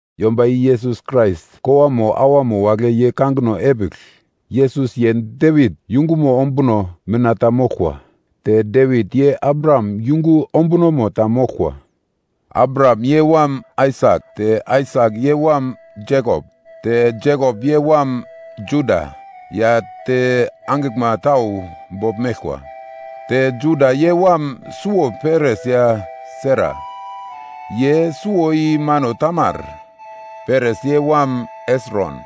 Yomba i Yesus Krais kowamo awamo wagle ye kangino epigl. Yesus ye Devit yungumo ombuno mina ta moglkwa. Te Devit ye Abraham yungu ombunomo ta moglkwa. Abraham ye wam Aisak, te Aisak ye wam Jekop, te Jekop ye wam Juda ya te angiglma tau bogl meglkwa. te Juda ye wam suwo Peres ya Sera. Ye suwo i mano Tamar. Peres ye wam Hesron,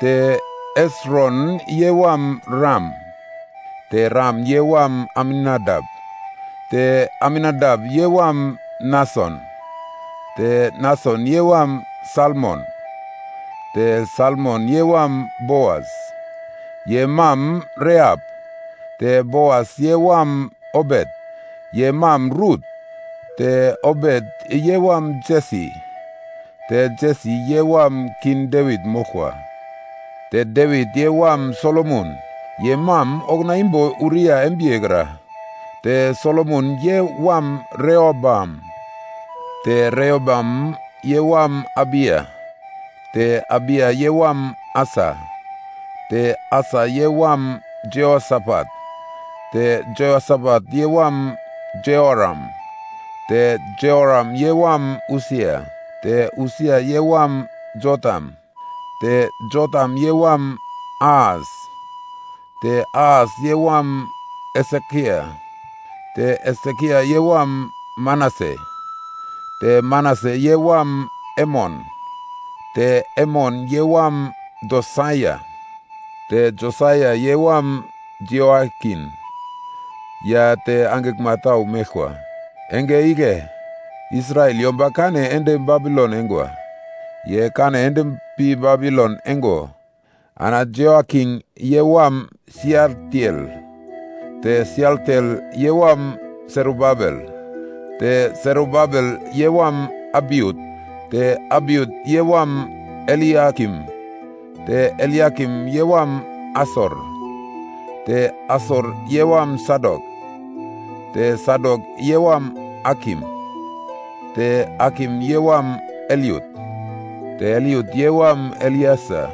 te Hesron ye wam Ram, te Ram ye wam Aminadap, te Aminadap ye wam Nason, te Nason ye wam Salmon, te Salmon ye wam Boas, ye mam Rehap, te Boas ye wam Obet, ye mam Rut, te Obet ye wam Jesi, te Jesi ye wam King Devit moglkwa, te Devit ye wam Solomon ye mam okuna imbo Uriya embiye kra, te Solomon ye wam Rehoboam, te Rehoboam ye wam Abiya, te Abiya ye wam Asa, te Asa ye wam Jehosafat, te Jehosafat ye wam Jehoram, te Jehoram ye wam Usia, te Usia ye wam Jotam, te Jotam ye wam Ahas, te Ahas ye wam Hesekia, te Hesekia ye wam Manase, te Manase ye wam Emon, te Emon ye wam Josaia, te Josaia ye wam Jehoiakin ya te angiglma tau meglkwa. Enge igle Israel yomba kane ende Babilon eingwa. Ye kane ende pi Babilon eingo, ana Jehoiakin ye wam Sialtiel, te Sialtiel ye wam Serubabel, te Serubabel ye wam Abiut, te Abiut ye wam Eliakim, te Eliakim ye wam Asor, te Asor ye wam Sadok, te Sadok ye wam Akim, te Akim ye wam Eliut, te Eliut ye wam Elieser,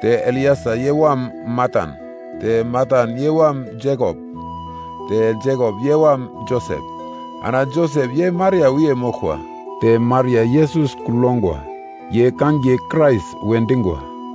te Elieser ye wam Matan, te Matan ye wam Jekop, te Jekop ye wam Josep. Ana Josep ye Maria wiye moglkwa. Te Maria Yesus kugl yongwa, ye kangiye Krais we dingwa.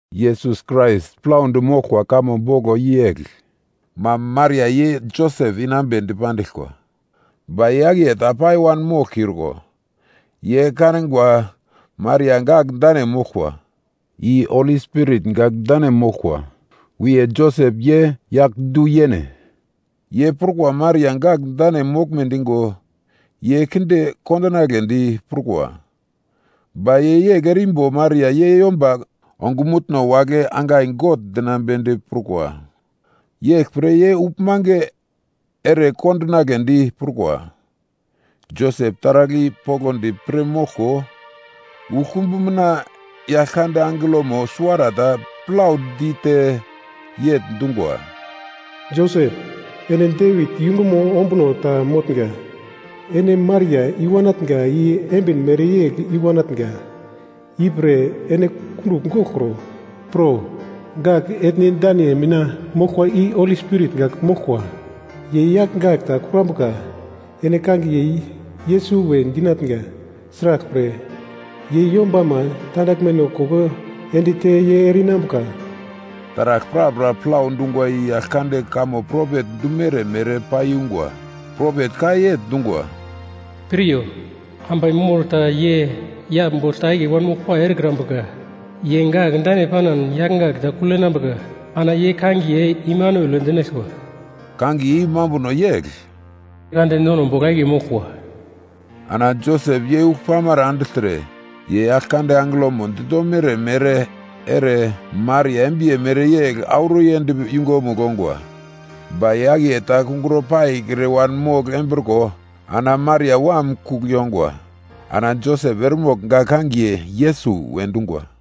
Yesus Krais plaudi moglkwa kamo boglo i yegl. Mam Maria ye Josep inambe dipandiglkwa. Ba ye akiye ta pai wanmoglkiurko, ye kanigwa Maria gak dane moglkwa. I Holi Spirit gak dane moglkwa. Wiye Josep, ye yagl du-yene. Ye prukwa Maria gak dane moglme digo, ye kinde kondinagledi prukwa. Ba ye yegl erimbo Maria ye yomba ongumutno wagle angai gogl dinambedi prukwa. Yeglpre ye uglmange ere kondinagledi prukwa. Josep taragl i poglodi pir moglko, uglkumbu mina Yaglkande angelomo suwarata plau dite yegl dungwa, “Josep, ene Devit yungumo ombuno ta motnga, ene Maria i-wanatnga i embin mereyegl i-wanatnga, ipre ene kundugl goglkro. Pro. Gak etne dane mina moglkwa i Holi Spirit gak moglkwa. Ye yagl gak ta kurambuka, ene kangiye Yesus we dinatnga. Sraglpre, ye yombama tandaglmeno koko ende te, ye ere-inambuka.” Taragl prapra plau dungwa i Yaglkande kamo propet dumere mere paiyungwa. Propet ka yegl dungwa, “Piryo, ambai mor ta ye yagl bogl ta akiye wanmoglpai erekrambuka. Ye gak dane panan yagl gak ta kugl yenambuka. Ana ye kangiye Imanuel we dinaglkwa.” Kangiye i mambunomo yegl, “God nono bogl akiye moglkwa.” Ana Josep ye ugl pamara andigltre, ye Yaglkande angelomo ditomere ere, Maria embiye mereyegl auro yend yungumugl ongwa. Ba ye akiye ta kungro paikre wanmogl embriko, ana Maria wam kugl yongwa. Ana Josep eremogl gak kangiye Yesus we dungwa.